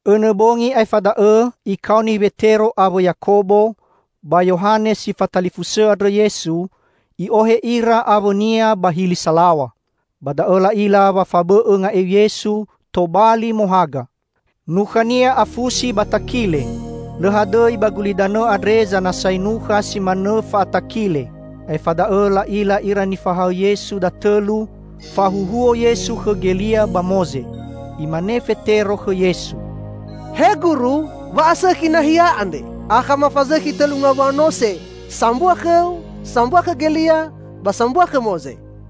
Õnõ bongi aefa da'õ Ikaoni Wetero awõ Yakobo ba Yohane si fatalifusõ andrõ Yesu, I'ohe ira awõ-Nia ba hili salaw̃a. Ba da'õ la'ila wa fabõ'õ nga'eu Yesu tobali mohaga. Nukha-Nia afusi ba takile. Lõ hadõi ba gulidanõ andre zanasai nukha si manõ fa'atakile. Aefa da'õ la'ila ira nifahaõ Yesu datõlu, fahuhuo Yesu khõ Gelia ba Moze. Imane Fetero khõ Yesu, "He Guru, wa'asõkhi nahia andre. Akha mafazõkhi tõlu ngawua nose: sambua khõ-U, sambua khõ Gelia ba sambua khõ Moze."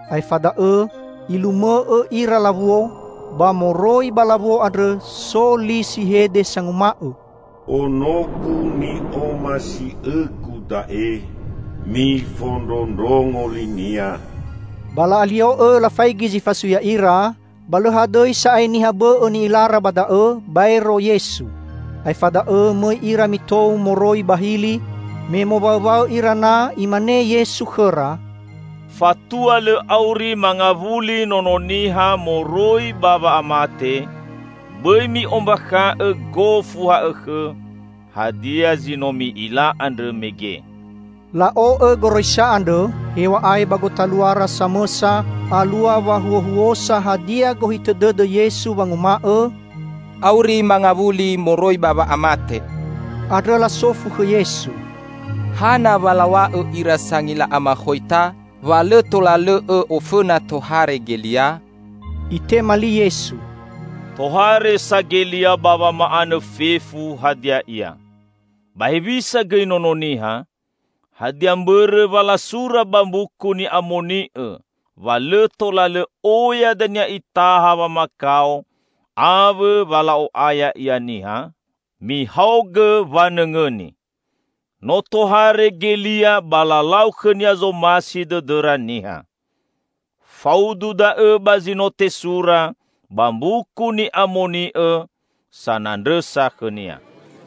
Aefa da'õ ilumõ'õ ira lawuo, ba moroi ba lawuo andrõ so li si hede sanguma'õ, "Ono-Gu ni'omasi'õ-Gu da'e. Mifondrondrongo li-Nia!" Ba la'alio'õ lafaigi zi fasui ya'ira, ba lõ hadõi sa'ae niha bõ'õ ni'ilara ba da'õ, baero Yesu. Aefa da'õ mõi ira mitou moroi ba hili. Me mowaõwaõ ira na, Imane Yesu khõra, "Fatua lõ auri mangawuli Nono Niha moroi ba wa'amate, bõi mi'ombakha'õ gofu ha'õkhõ hadia zi no mi'ila andrõ mege." La'o'õ goroisa andrõ, hew̃a'ae ba gotaluara samõsa alua wahuohuosa hadia gohitõ dõdõ Yesu wanguma'õ, "auri mangawuli moroi ba wa'amate". Andrõ lasofu khõ Yesu, "Hana wa law̃a'õ ira sangila amakhoita wa lõ tola lõ'õ ofõna tohare Gelia?" Itema li Yesu, "Tohare sa Gelia ba wama'anõ fefu hadia ia. Ba hewisa gõi Nono Niha? Hadia mbõrõ wa lasura ba Mbuku Ni'amoni'õ wa lõ tola lõ oya dania Itaha wamakao awõ wa la'o'aya Ia niha? Mihaogõ wanõngõni: No tohare Gelia ba lalau khõnia zomasi dõdõra niha. Faudu da'õ ba zi no tesura ba Mbuku Ni'amoni'õ sanandrõsa khõnia."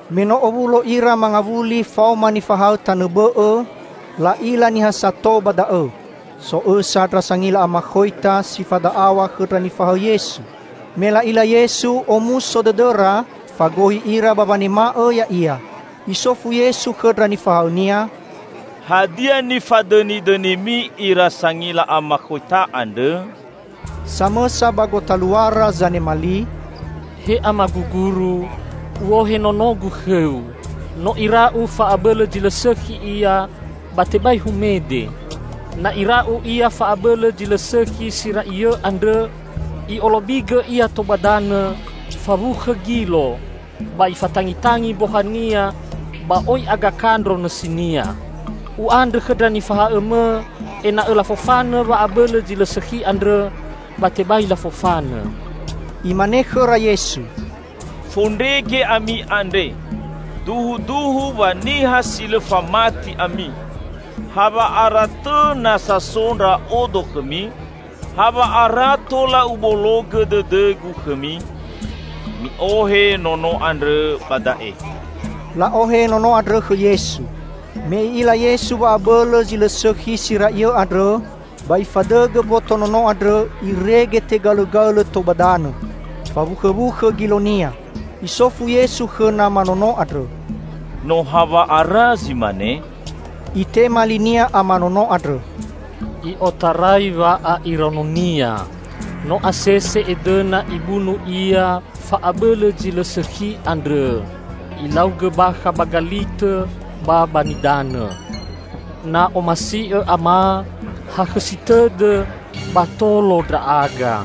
Me no owulo ira mangawuli faoma nifahaõ tanõ bõ'õ, la'ila niha sato ba da'õ. So õsa ndra sangila amakhoita si fada'aw̃a khõ ndra nifahaõ Yesu. Me la'ila Yesu, omuso dõdõra, fagohi ira ba wanema'õ Ya'ia. Isofu Yesu khõ ndra nifahaõ-Nia, "Hadia nifadõnidõnimi ira sangila amakhoita andrõ?" Samõsa ba gotaluara zanema li, "He Amagu Guru, u'ohe nonogu khõ-U. No ira'u fa'abõlõ zi lõ sõkhi ia ba tebai humede. Na ira'u ia fa'abõlõ zi lõ sõkhi si ra'iõ andrõ, i'olobigõ ia tou ba danõ, fawukhõ gilo, ba ifatangitangi mbohania ba oi agakandro nõsinia. U'andrõ khõ ndra nifahaõ-Mõ ena'õ lafofanõ wa'abõlõ zi lõ sõkhi andrõ, ba tebai lafofanõ." Imane khõra Yesu, "Fondrege ami andre! Duhuduhu wa niha si lõ famati ami! Hawa'ara tõ nasa so Ndra'odo khõmi? Hawa'ara tola Ubologõ dõdõ-Gu khõmi? Mi'ohe nono andrõ ba da'e!" La'ohe nono andrõ khõ Yesu. Me I'ila Yesu wa'abõlõ zi lõ sõkhi si ra'iõ andrõ, ba ifadõgõ mboto nono andrõ irege tegaõlõgaõlõ tou ba danõ. Fawukhõwukhõ gilonia. Isofu Yesu khõ nama nono andrõ, "No hawa'ara zi mane?" Itema linia ama nono andrõ, "I'otarai wa'a'iraononia!" "No asese edõna ibunu ia fa'abõlõ zi lõ sõkhi andrõ, ilaugõ bakha ba galitõ ba ba nidanõ. Na omasi'õ ama, hakhõsi tõdõ ba tolo ndra'aga!"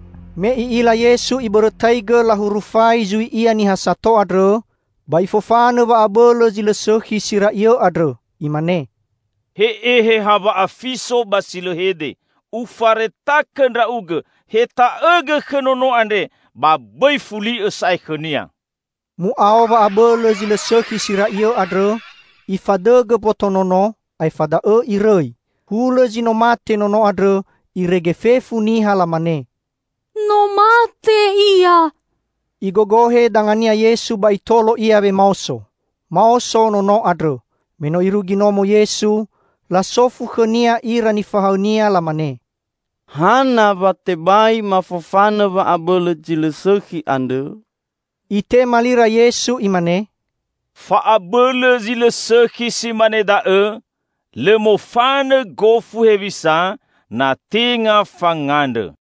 Me I'ila Yesu ibõrõgõ lahurufai zui Ia niha sato andrõ, ba Ifofanõ wa'abõlõ zi lõ sõkhi si ra'iõ andrõ. Imane, "He Eheha wa'afiso ba si lõ hede, Ufaretakõ ndra'ugõ, heta'õgõ khõ nono andre, ba bõi fuli'õ sa'ae khõnia!" Mu'ao wa'abõlõ zi lõ sõkhi si ra'iõ andrõ, ifadõgõ mboto nono, aefa da'õ irõi. Hulõ zi no mate nono andrõ irege fefu niha lamane, "No mate ia!" Igogohe dangania Yesu ba Itolo ia wemaoso. Maoso nono andrõ. Me no Irugi nomo Yesu, lasofu khõ-Nia ira nifahaõ-Nia lamane, "Hana wa tebai mafofanõ wa'abõlõ zi lõ sõkhi andrõ?" Itema lira Yesu, Imane, "Fa'abõlõ zi lõ sõkhi si mane da'õ lõ mofanõ gofu hewisa, na tenga fangandrõ."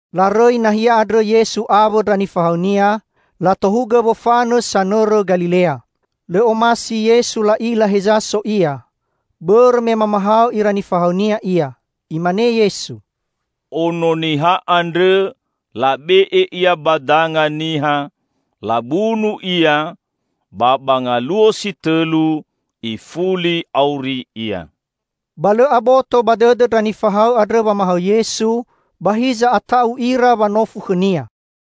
Larõi nahia andrõ Yesu awõ ndra nifahaõ-Nia, latohugõ wofanõ sanõrõ Galilea. Lõ omasi Yesu la'ila heza so Ia, bõrõ me mamahaõ ira nifahaõ-Nia Ia. Imane Yesu, "Ono Niha andrõ labe'e Ia ba danga niha, labunu Ia, ba ba ngaluo si tõlu ifuli auri Ia!" Ba lõ aboto ba dõdõ ndra nifahaõ andrõ wamahaõ Yesu, ba hiza ata'u ira wanofu khõ-Nia.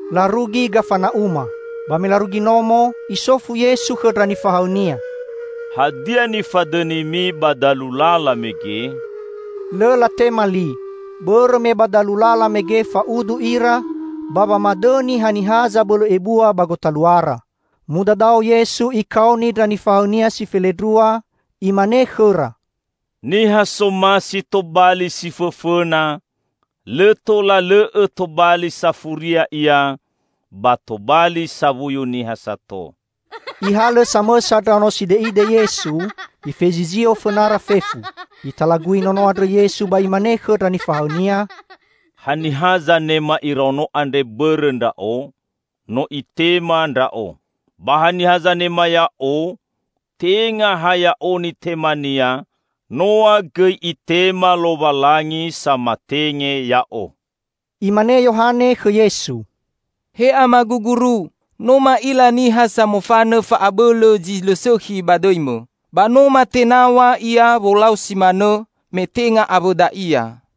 Larugi Gafana'uma. Ba me larugi nomo, Isofu Yesu khõ ndra nifahaõ-Nia, "Hadia nifadõnimi ba dalu lala mege?" Lõ latema li, bõrõ me ba dalu lala mege fa'udu ira ba wamadõni haniha zabõlõ ebua ba gotaluara. Mudadao Yesu Ikaoni ndra nifahaõ-Nia si felendrua, Imane khõra, "Niha somasi tobali si fõfõna lõ tola lõ'õ tobali safuria ia ba tobali sawuyu niha sato." Ihalõ samõsa ndraono side'ide Yesu, Ifezizio fõnara fefu. Italagui nono andrõ Yesu ba Imane khõ ndra nifahaõ-Nia, "Haniha zanema iraono andre bõrõ Ndra'o, no itema Ndra'o. Ba haniha zanema Ya'o, tenga ha Ya'o nitemania, noa gõi itema Lowalangi samatenge Ya'o." Imane Yohane khõ Yesu, "He Amagu Guru, no ma'ila niha samofanõ fa'abõlõ zi lõ sõkhi ba dõi-Mõ. Ba no matenaw̃a ia wolau si manõ me tenga awõda ia."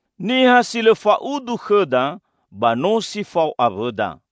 Niha si lõ fa'udu khõda, ba no si fao awõda.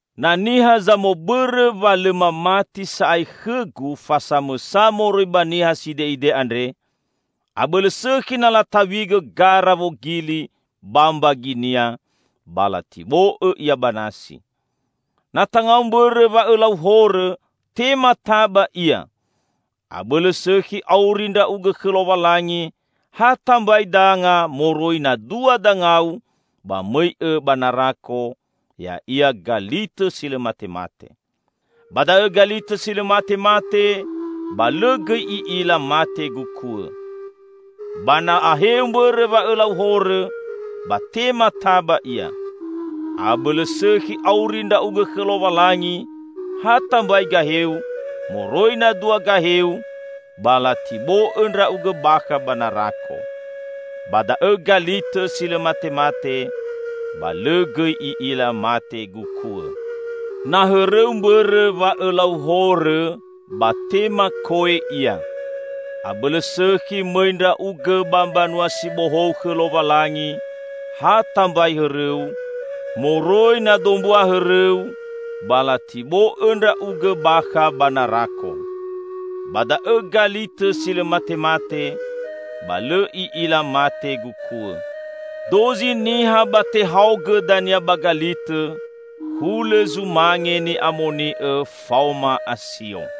"Na niha zamobõrõ wa lõ mamati sa'ae khõ-Gu fa samõsa moroi ba niha side'ide andre, abõlõ sõkhi na lataw̃igõ gara wogili ba mbaginia ba latibo'õ ia ba nasi. Na tangau mbõrõ wa õlau horõ, tema taba ia! Abõlõ sõkhi auri ndra'ugõ khõ Lowalangi ha tambai danga moroi na dua dangau ba mõi'õ ba narako, ya'ia galitõ si lõ matemate. [Ba da'õ galitõ si lõ matemate, ba lõ gõi i'ila mate gukuõ.] Ba na aheu mbõrõ wa õlau horõ, ba tema taba ia. Abõlõ sõkhi auri ndra'ugõ khõ Lowalangi ha tambai gaheu moroi na dua gaheu ba latibo'õ ndra'ugõ bakha ba narako. [Ba da'õ galitõ si lõ matemate, ba lõ gõi i'ila mate gukuõ.] Na hõrõu mbõrõ wa õlau horõ, ba tema ko'e ia! Abõlõ sõkhi mõi ndra'ugõ ba Mbanua si Bohou khõ Lowalangi ha tambai hõrõu, moroi na dombua hõrõu ba latibo'õ ndra'ugõ bakha ba narako. Ba da'õ galitõ si lõ matemate, ba lõ i'ila mate gukuõ. Dozi niha ba tehaogõ dania ba galitõ, hulõ zumange ni'amoni'õ faoma asio.